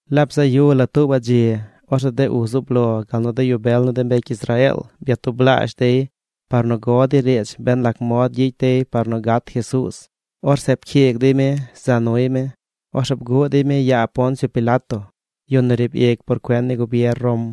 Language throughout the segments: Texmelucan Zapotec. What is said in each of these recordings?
Laab bzaꞌ yu la tuubaꞌ dzi, orzeꞌ de uz zub lo gal nu de yu bel ni de mbecy Israeel byatublaazh dey par nu go dey riidz ben lac mod gyicy dey par nu gat Jesuuz. Orzeꞌ pcyiig dey mi za nuy mi. Orzeꞌ bguꞌ dey mi yaa Poncio Pilato, yu nu riib ic por cuen ni gubier Rom.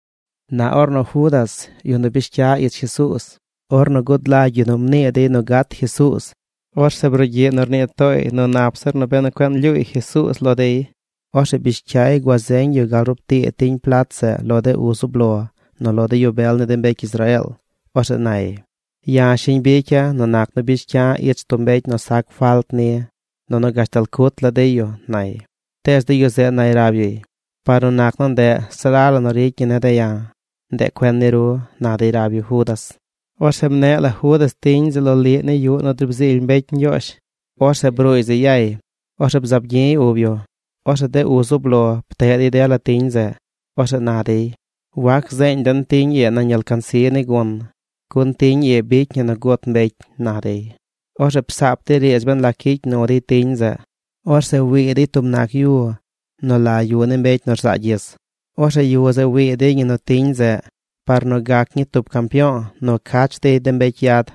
Na ornu Judas, yu nu bish cya ich Jesuuz, ornu gud lagy yu nu mnii dey nu gat Jesuuz, orzeꞌ brugyiꞌ nu rnii tooy nu nap zir benu cueꞌ ñlyuuy Jesuuz lo dey. Orzeꞌ bish cyay gua zeeñ yu gal rub tii tiñ plat zeꞌ lo de uz zub lo, nu lo de yu bel ni de mbecy Israeel. Orzeꞌ nay: ―Ya̱ shiñ bicya̱ nu nac nu bish cya̱ ich tub mbecy nu sac falt ni, nunu gashtal cut la dey yu ―nay. Tees de yu zeꞌ nay rab yuy: ―Par nu nac nu ndeꞌ se la la nu ricy ñi ne̱ de̱ ya̱. ¡Ndeꞌ cuen ni ru! ―na dey rab yu Judas. Orzeꞌ mneꞌ la Judas tiñ zeꞌ loliꞌ ni yuꞌ nu driib zily mbecy Ñgyoozh. Orzeꞌ bruuy zeꞌ yay. Orzeꞌ bzaab gyi̱y ub yu. Orzeꞌ de uz zub lo pteꞌ dey dela tiñ zeꞌ. Orzeꞌ na dey: ―Wac zeeñ den tiñ ii nañ alcansi ni gun, gun tiñ ii bicy ñi nu gut mbecy ―na dey. Orzeꞌ psaap dey riidz ben lac gyicy nu dey tiñ zeꞌ. Orzeꞌ wii dey tub nac yu nu la Yu ni Mbecy nu Rzaa Gyis. Orzeꞌ yu zeꞌ wii dey ñi nu tiñ zeꞌ, par nu gac ñii tub campyo̱o̱ nu cach dey de mbecy yad.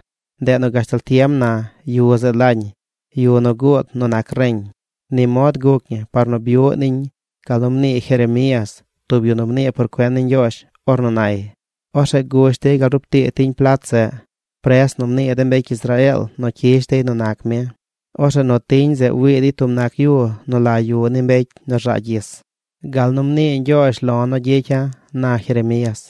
Ndeꞌ nu gashtal tiem na, yu zeꞌ lañ Yu nu Guud nu Nac Reñ. Ni mod guc ñi par nu byuꞌ niñ gal nu mnii Jeremías, tub yu nu mnii por cuen ni Ñgyoozh, ornu nay: Orzeꞌ gush dey gal rub tii tiñ plat zeꞌ, pres nu mnii de mbecy Israeel nu cyish dey nu nac mi. Orzeꞌ nu tiñ zeꞌ wii dey tub nac yu nu la Yu ni Mbecy nu Rzaa Gyis, gal nu mnii Ñgyoozh lo̱ nu gyicya̱, na Jeremías.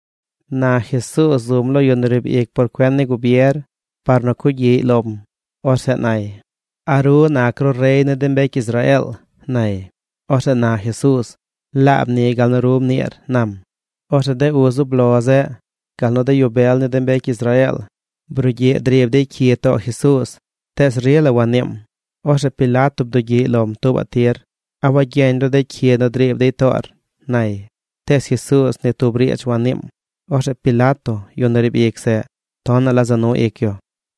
Na Jesuuz zum lo yu nu riib ic por cuen ni gubier par nu cugyiꞌy lom. Orzeꞌ nay: ―¿A ru nac ru rey ni de mbecy Israeel? ―nay. Orzeꞌ na Jesuuz: ―Laab ni gal nu ru mniir ―nam. Orzeꞌ de uz zub lo zeꞌ gal nu de yu bel ni de mbecy Israeel brugyiꞌ driib dey cyi too Jesuuz, tees rila wanniim. Orzeꞌ Pilato bdugyiꞌy lom tuubaꞌ tir: ―¿A wagyeñ ru de cyi nu driib dey toor? ―nay. Tees Jesuuz ni tub riidz wanniim. Orzeꞌ Pilato, yu nu riib ic zeꞌ, tonaꞌ la za nu ic yu.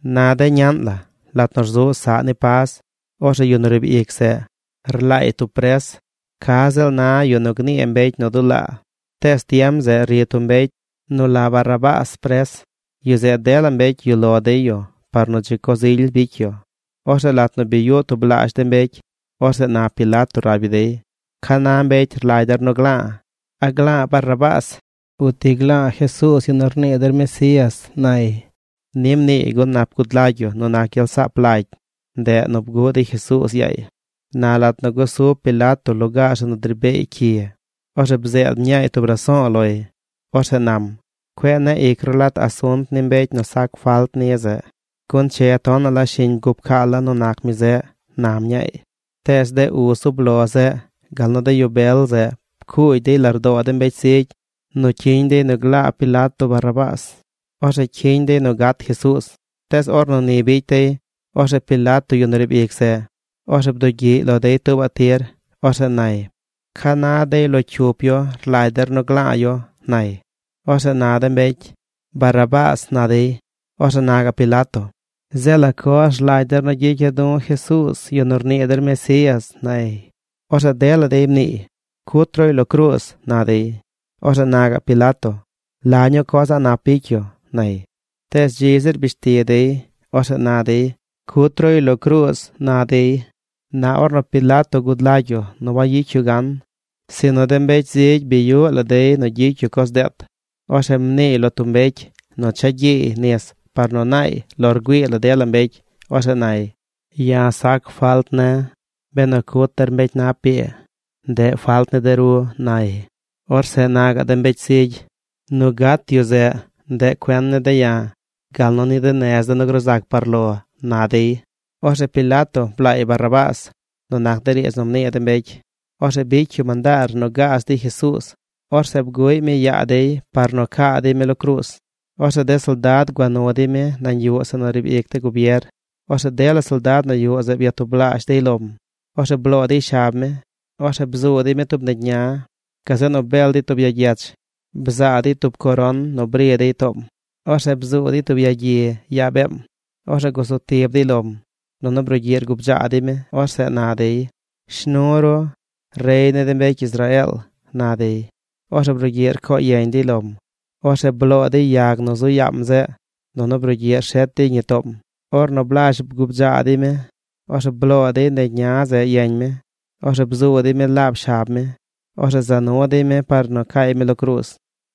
Na de ñaꞌn la, lat nu rzuꞌ saꞌ ni Pas, orzeꞌ yu nu riib ic zeꞌ, rlaay tub pres: ca ziꞌl na yu nu gnii mbecy nu dulaa. Tees tiem zeꞌ ri tub mbecy nu la Barrabás pres. Yu zeꞌ dela mbecy yuꞌ lo dey yu par nu dzi coz ily bicy yu. Orzeꞌ lat nu bi yuꞌ tublaazh de mbecy, orzeꞌ na Pilato rab yu dey: ―¿Ca na mbecy rlagy der nu gla̱a̱? ¿A gla̱a̱ Barrabás o ti gla̱a̱ Jesuuz, yu nu rnii der Mesías? ―nay. Ni mniiy gun nap gud lagy yu nu nac gyel rasaap lagy, ndeꞌ nu bguꞌ dey Jesuuz yaay. Na lat nu gusub Pilato lugaar zeꞌ nu dri beey cyi, orzeꞌ bzeed mñaay tub raso̱o̱ loy. Orzeꞌ nam: “Cueꞌ neꞌ ic ru lat asunt ni mbecy nu sac falt ni zeꞌ, gun che tonaꞌ la shiñ bguu pcaala̱ nu nac mi zeꞌ”, na mñaay. Tees de uz zub lo zeꞌ gal nu de yu bel zeꞌ pcuugy dey lardoo de mbecy zigy nu cyiñ dey nu glaa Pilato Barrabás. Orzeꞌ cyiñ dey nu gat Jesuuz. Tees ornu ni bicy dey, orzeꞌ Pilato, yu nu riib ic zeꞌ, orzeꞌ bdugyiꞌy lo dey tuubaꞌ tir. Orzeꞌ nay: ―¿Ca na dey lo cyup yu rlagy der nu gla̱a̱ yu? ―nay. Orzeꞌ na de mbecy: ―¡Barrabás! ―na dey. Orzeꞌ na gaꞌ Pilato: ―Zeꞌ ¿la coz rlagy der nu gyicya̱ du̱ Jesuuz, yu nu rnii der Mesías? ―nay. Orzeꞌ dela dey mniiy: ―¡Cut ruy lo cruuz! ―na dey. Orzeꞌ na gaꞌ Pilato: ―¿La ñuu coz a̱ꞌ nap bicy yu? ―nay. Tees dzi zir bish ti dey. Orzeꞌ na dey: ―¡Cut ruy lo cruuz! ―na dey. Na ornu Pilato gud lagy yu nu wayicy yu gan, sinu de mbecy zigy bi yuꞌ la dey nu gyicy yu coz deet, orzeꞌ mniiy lo tub mbecy nu cha gyiiy nis par nu naay lo rgüii la dela mbecy. Orzeꞌ nay: ―Ya̱ sac falt ne̱. Benu cut der mbecy nap ii, ndeꞌ falt ni de ru ―nay. Orzeꞌ na gaꞌ de mbecy zigy: ―Nu gat yu zeꞌ, ndeꞌ cuen ne̱ de̱ ya̱, gal nu ni de nez de̱ nu gruu zac par lo ―na dey. Orzeꞌ Pilato blaay Barrabás nu nac de riidz nu mnii de mbecy. Orzeꞌ bicy yu mandaar nu gaaz dey Jesuuz. Orzeꞌ bguꞌy mi yaa dey par nu caa dey mi lo cruuz. Orzeꞌ de soldad gua nu dey mi nañ yuꞌ zeꞌ nu riib ic de gubier. Orzeꞌ dela soldad nu yuꞌ zeꞌ byatublaazh dey lom. Orzeꞌ bloo dey shab mi. Orzeꞌ bzuu dey mi tub negy ña. Gazeꞌ nu bel dey ya gyech. Bzaa dey tub coron nu bri dey toom. Orzeꞌ bzuu dey tub yagyi yaa beem. Orzeꞌ gusu tib dey lom. Nunu brugyiꞌ rguu bdzaa dey mi. Orzeꞌ na dey: ―Shnu ru, rey ni de mbecy Israeel ―na dey. Orzeꞌ brugyiꞌ rco yeñ dey lom. Orzeꞌ bloo dey yag nu zu yaam zeꞌ, nunu brugyiꞌ rshet dey ñi toom. Ornu blazh bguu bdzaa dey mi, orzeꞌ bloo dey negy ña zeꞌ yeñ mi. Orzeꞌ bzuu dey mi laab shab mi. Orzeꞌ za nu dey mi par nu caay mi lo cruuz.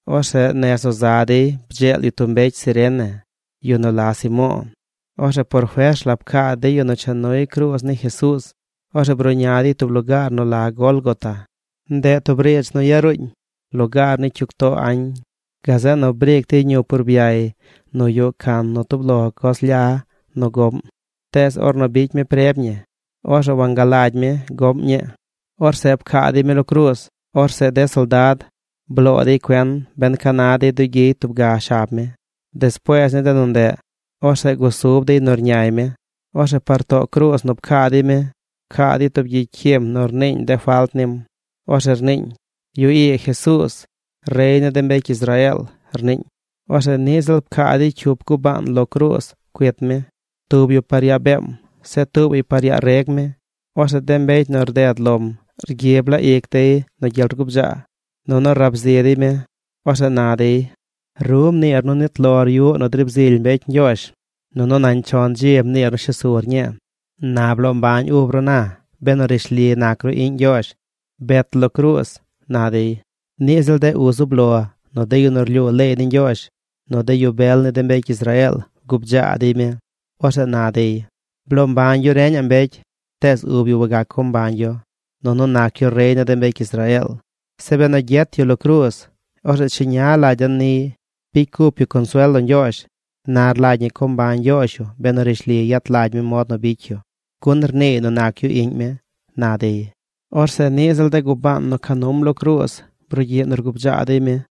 Orzeꞌ nez nu za dey bdzeel yu tub mbecy Cirene, yu nu la Simo̱o̱. Orzeꞌ por fers la pcaa dey yu nu cha nuy cruuz ni Jesuuz. Orzeꞌ bruꞌña dey tub lugaar nu la Gólgota. Ndeꞌ tub riidz nu yaruuñ: Lugaar ni cyug too añ. Gazeꞌ nu briic dey ñup urbyay nu yuꞌ can nu tub lo coz lya nu goꞌm. Tees ornu bicy mi preb ñi, orzeꞌ wangalagy mi goꞌm ñii. Orzeꞌ pcaa dey mi lo cruuz. Orzeꞌ de soldad bloo dey cuen ben ca na dey dugyiy tub ga shab mi. Despuees ni de nu ndeꞌ, orzeꞌ gusub dey nu rñay mi. Orzeꞌ par too cruuz nu pcaa dey mi, pcaa dey tub gyicy cyim nu rniiñ de falt nim. Orzeꞌ rniiñ: “Yu ii Jesuuz, rey ni de mbecy Israeel”, rniiñ. Orzeꞌ niꞌ ziꞌl pcaa dey cyup gubaan lo cruuz cuit mi: tub yu par yaa beem, zeꞌ tuubaꞌy par yaa reg mi. Orzeꞌ de mbecy nu rded lom rgyib la ic dey nu gyel rgubdzaa, nunu rab zi dey mi. Orzeꞌ na dey: ―Ru mniir nu nit lor yuꞌ nu driib zily mbecy Ñgyoozh, nunu nañ chon dzi mniir nu shes sur ñii. ¡Na bloo mbañ ub ru na! Benu rishli nac ru iꞌñ Ñgyoozh. ¡Bet lo cruuz! ―na dey. Niꞌ ziꞌl de uz zub lo, nu de yu nu rlyuu leey ni Ñgyoozh, nu de yu bel ni de mbecy Israeel bgubdzaa dey mi. Orzeꞌ na dey: ―Bloo mbañ yu reñaꞌ mbecy, tees ub yu wagac co mbañ yu. Nunu nac yu rey ni de mbecy Israeel. Zeꞌ benu gyet yu lo cruuz, orzeꞌ cheña lagy den niy. Bicy cup yu consuel lo Ñgyoozh. Na rlagy ñi co mbañ Ñgyoozh yu benu rishli yet lagy mi mod nu bicy yu, gun rniiy nu nac yu iꞌñ mi ―na dey. Orzeꞌ niꞌ ziꞌl de gubaan nu ca num lo cruuz brugyiꞌ nu rgubdzaa dey mi.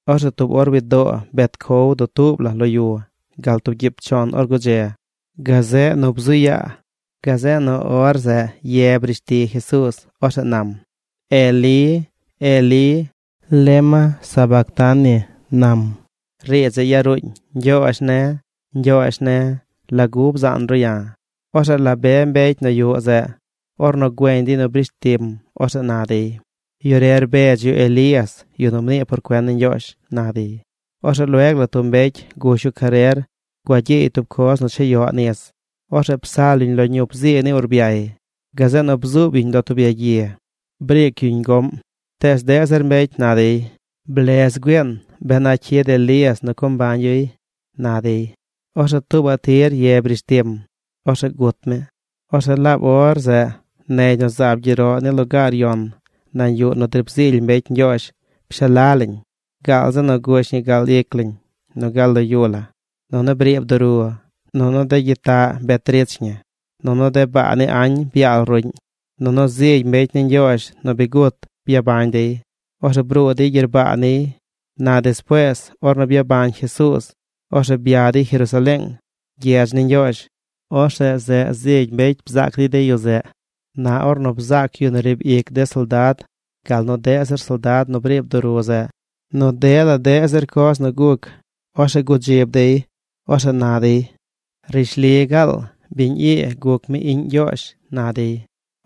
Orzeꞌ tub or widoo bet cow dutuub la lo yu gal tub gyiib chon or gudze, gazeꞌ nu bzu yaa. Gazeꞌ nu or zeꞌ ye brish ti Jesuuz. Orzeꞌ nam: ―Elí, Elí, ¿lema sabactani? ―nam. Riidz zeꞌ yaruuñ: “Ñgyoozh ne̱, Ñgyoozh ne̱, ¿lagu bzaan ru ya̱?” Orzeꞌ la be mbecy nu yuꞌ zeꞌ, ornu güeñ dey nu brish tim, orzeꞌ na dey: ―Yu re rbedz yu Elías, yu nu mnii por cuen ni Ñgyoozh ―na dey. Orzeꞌ lueg la tub mbecy gush yu carer gua gyiiy tub coz nu chayoꞌ nis. Orzeꞌ psal yuñ lo ñup zii ni urbyay. Gazeꞌ nu bzuub yuñ lo tub yagyi. Briic yuñ goꞌm. Tees deꞌ zir mbecy na dey: ―Blez güiin, ben a cyid Elías nu co mbañ yuy ―na dey. Orzeꞌ tuubaꞌ tir ye brish tim. Orzeꞌ gut mi. Orzeꞌ laab or zeꞌ negy nu zaab gyeroꞌ ni lugaar yon nañ yuꞌ nu driib zily mbecy Ñgyoozh pshala lañ gaal zi nu gush ñi gal ic lañ nu gal lo yu la. Nunu briib duru. Nunu de gyitaꞌ bet rich ñi. Nunu de baa ni añ byaal ruꞌñ. Nunu zigy mbecy ni Ñgyoozh nu bi gut byabañ dey. Orzeꞌ bruu dey gyerbaa niy. Na despuees, ornu byabañ Jesuuz, orzeꞌ bya dey Jerusaleeng, gyedz ni Ñgyoozh. Orzeꞌ zeꞌ zigy mbecy bzaac dey de yu zeꞌ. Na ornu bzaac yu nu riib ic de soldad gal nu deꞌ zir soldad nu briib duru zeꞌ nu dela deꞌ zir coz nu guc, orzeꞌ gudzib dey. Orzeꞌ na dey: ―¡Rishli gaal biñ ii guc mi iꞌñ Ñgyoozh! ―na dey.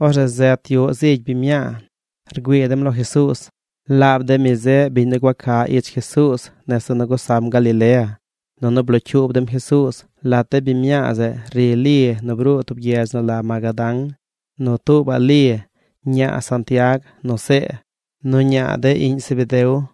Orzeꞌ zet yuꞌ zigy biñ mñaa. Rgüii dem lo Jesuuz. Laab de mi zeꞌ biñ nu gua ca ich Jesuuz nese nu gusam Galilea, nunu blocyuub dem Jesuuz. Lat de biñ mñaa zeꞌ ri Li nu bruu tub gyedz nu la Magadán, nu tuubaꞌ Li, ñaa Santiag nu See, nu ñaa de iꞌñ Zebedeo.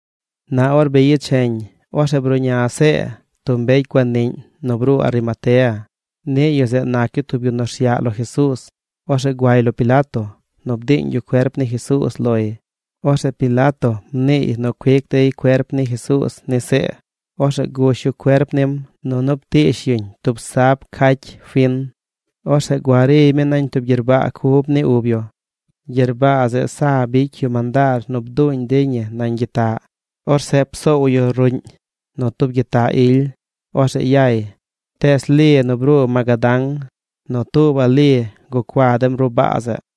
Na or bi yecheñ, orzeꞌ bruꞌña See, tub mbecy guaniꞌñ nu bruu Arimatea. Niꞌ yu zeꞌ nac yu tub yu nu rsyaꞌ lo Jesuuz. Orzeꞌ guay lo Pilato, nu bdiiñ yu cuerp ni Jesuuz loy. Orzeꞌ Pilato mniiy nu cuic dey cuerp ni Jesuuz ni See. Orzeꞌ gush yu cuerp nim, nunu ptiish yuñ tub sab cacy fin. Orzeꞌ gua riy mi nañ tub gyerbaa cub ni ub yu. Gyerbaa zeꞌ sa bicy yu mandaar nu bduuñ dey ñi nañ gyitaꞌ. Orzeꞌ psoow yu ruꞌñ nu tub gyitaꞌ ily. Orzeꞌ yay. Tees Li nu bruu Magadán, nu tuubaꞌ Li gucua dem ruꞌ baa zeꞌ.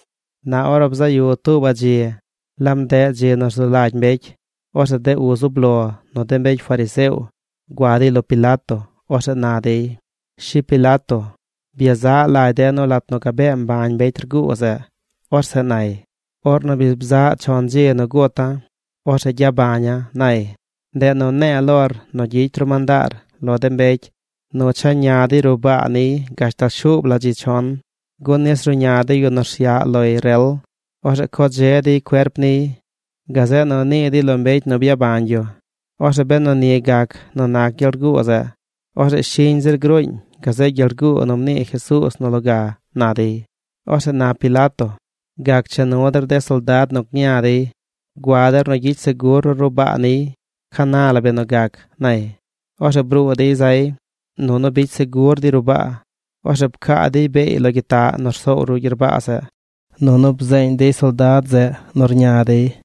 Na or bzaꞌ yu tuubaꞌ dzi, laab ndeꞌ dzi nu rzu lagy mbecy, orzeꞌ de uz zub lo, nu de mbecy fariseo gua dey lo Pilato. Orzeꞌ na dey: ―Shi Pilato, byezaꞌ lagy de̱ nu lat nu gabee mbañ mbecy rguu zeꞌ, orzeꞌ nay: “Ornu bi bzaꞌ chon dzi nu guta̱, orzeꞌ gyabaña̱”, nay. Ndeꞌ nu ne̱e̱ lor nu gyicy ru mandaar lo de mbecy nu cha ña dey ruꞌ baa niy gashtal shuub la dzi chon, gun nis ruꞌña de yu nu rsyaꞌ loy rel. Orzeꞌ co dze dey cuerp niy. Gazeꞌ nu nii dey lo mbecy nu byabañ yu. Orzeꞌ benu ni gac nu nac gyel rguu zeꞌ, orzeꞌ shiñ zir gruuñ gazeꞌ gyel rguu nu mnii Jesuuz nu loga ―na dey. Orzeꞌ na Pilato: ―Gac cha nu der de soldad nu gña dey. Gua der nu gyicy segur ru ruꞌ baa niy. Ca na la benu gac ―nay. Orzeꞌ bruu dey zay. Nunu bicy segur dey ruꞌ baa. Orzeꞌ pcaa dey beey lo gyitaꞌ nu rsoow ruꞌ gyerbaa zeꞌ. Nunu bzeeñ dey soldad zeꞌ nu rña dey.